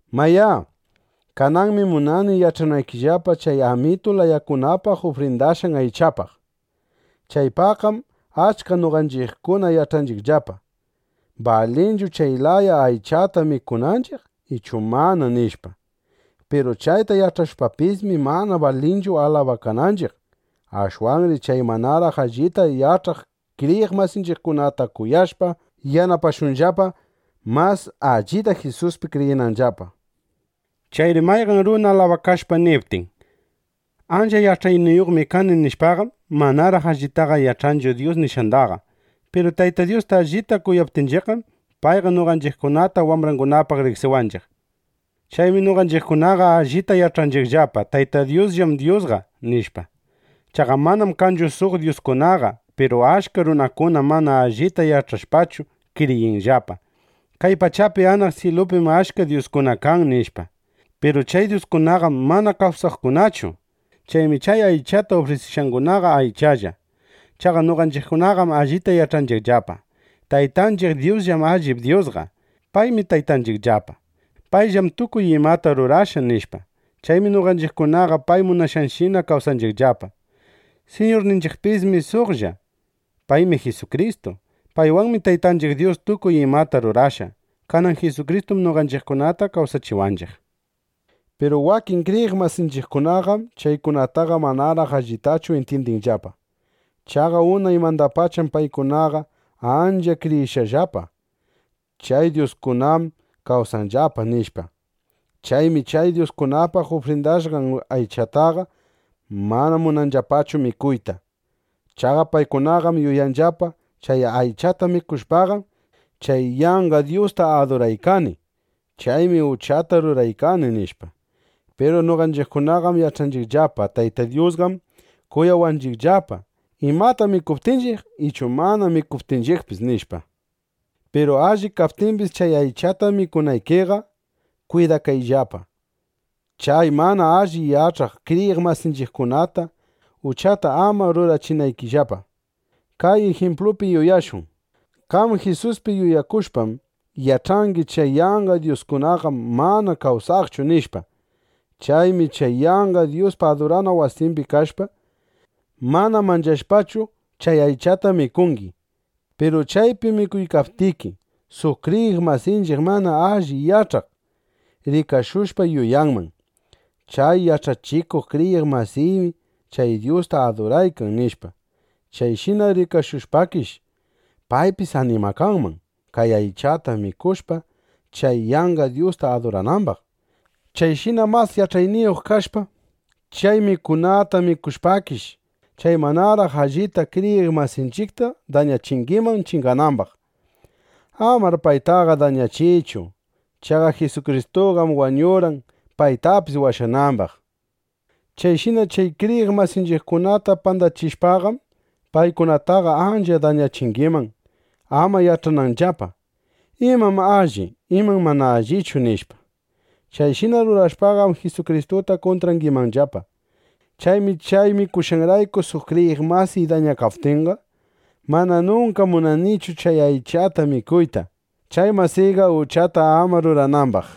Mayá, kananmi munani yach'anaykillapa chay amitu layakunapaq ufrindashqan aychapaq. Chaypaqqam achka noqanchiqkuna yach'anchiqllapa: ¿Balinchu chay laya aychata mikunanchiq ichu mana, nishpa? Piru chayta yach'ashpapismi, mana balinchu alabakananchiq. Ashwanri chay manaraq allita yach'aq kriyiq masinchiqkunata kuyashpa yanapashunllapa, mas allita Jisuspi kriyinanllapa. Chayri mayqan runa alabakashpa niptin: “Ancha yach'ayniyuqmi kani”, nishpaqam, manaraq allitaqa yach'anchu Dyus nishqandaqa. Piru Tayta Dyusta allita kuyaptinchiqqam, payqa noqanchiqkunata wambrangunapaq riqsiwanchiq. Chaymi noqanchiqkunaqa allita yach'anchiqllapa: Tayta Dyusllam Dyusqa, nishpa. Chaqa manam kanchu suq dyuskunaqa. Piru achka runakunam mana allita yach'ashpachu, kriyinllapa: Kay pachapi anaq syilupim achka dyuskuna kan, nishpa. Piru chay dyuskunaqam mana kawsaqkunachu. (Chaymi chay aychata ufrisishqangunaqa aychalla.) Chaqa noqanchiqkunaqam allita yach'anchiqllapa: Taytanchiq Dyusllam allip Dyusqa. Paymi Taytanchiqllapa. Payllam tukuy imata rurashqa, nishpa. Chaymi noqanchiqkunaqa pay munashqanshina kawsanchiqllapa. Siñurninchiqpismi suqlla. Paymi Jisukristu. Paywanmi Taytanchiq Dyus tukuy imata rurashqa. Kanan Jisukristum noqanchiqkunata kawsachiwanchiq. Piru wakin kriyiq masinchiqkunaqam chaykunataqa manaraq allitachu intyindinllapa. Chaqa unaymandapacham paykunaqa ancha kriyishqallapa: Chay dyuskunam kawsanllapa, nishpa. Chaymi chay dyuskunapaq ufrindashqan aychataqa mana munanllapachu mikuyta. Chaqa paykunaqam yuyanllapa: Chay aychata mikushpaqam, chay yanqa dyusta aduraykani. Chaymi uchata ruraykani, nishpa. Piru noqanchiqkunaqam yach'anchiqllapa: Tayta Dyusqam kuyawanchiqllapa, imata mikuptinchiq ichu mana mikuptinchiqpis, nishpa. Piru alli kaptimbis chay aychata mikunaykiqa, kwidakayllapa, chay mana alli yach'aq kriyiq masinchiqkunata uchata ama rurachinaykillapa. Kay ijimplupi yuyashun: Qam Jisuspi yuyakushpam, yach'angi: Chay yanqa dyuskunaqam mana kawsaqchu, nishpa. Chaymi chay yanqa dyuspa adurana wasimbi kashpa, mana manchashpachu, chay aychata mikungi. Piru chaypi mikuykaptiki, suq kriyiq masinchiq mana alli yach'aq, rikashushpa yuyanman: Chay yach'ayniyuq kriyiq masiymi chay dyusta aduraykan, nishpa. Chayshina rikashushpakish, paypis animakanman chay aychata mikushpa, chay yanqa dyusta aduranambaq. Chayshina mas yach'ayniyuq kashpa, chay mikunata mikushpakish, chay manaraq allita kriyiq masinchiqta dañachingiman chinganambaq. ¡Amar paytaqa dañachiychu! Chaqa Jisukristuqam wañurqan, paytapis washanambaq. Chayshina chay kriyiq masinchiqkunata pandachishpaqam, paykunataqa ancha dañachingiman, ama yach'ananllapa: ¿Imam alli, imam mana allichu? nishpa. Chayshina rurashpaqam, Jisukristuta kuntrangimanllapa. Chaymi chay mikushqayrayku suq kriyiq masiy dañakaptinqa, mana nunka munanichu chay aychata mikuyta, chay masiyqa uchata ama ruranambaq.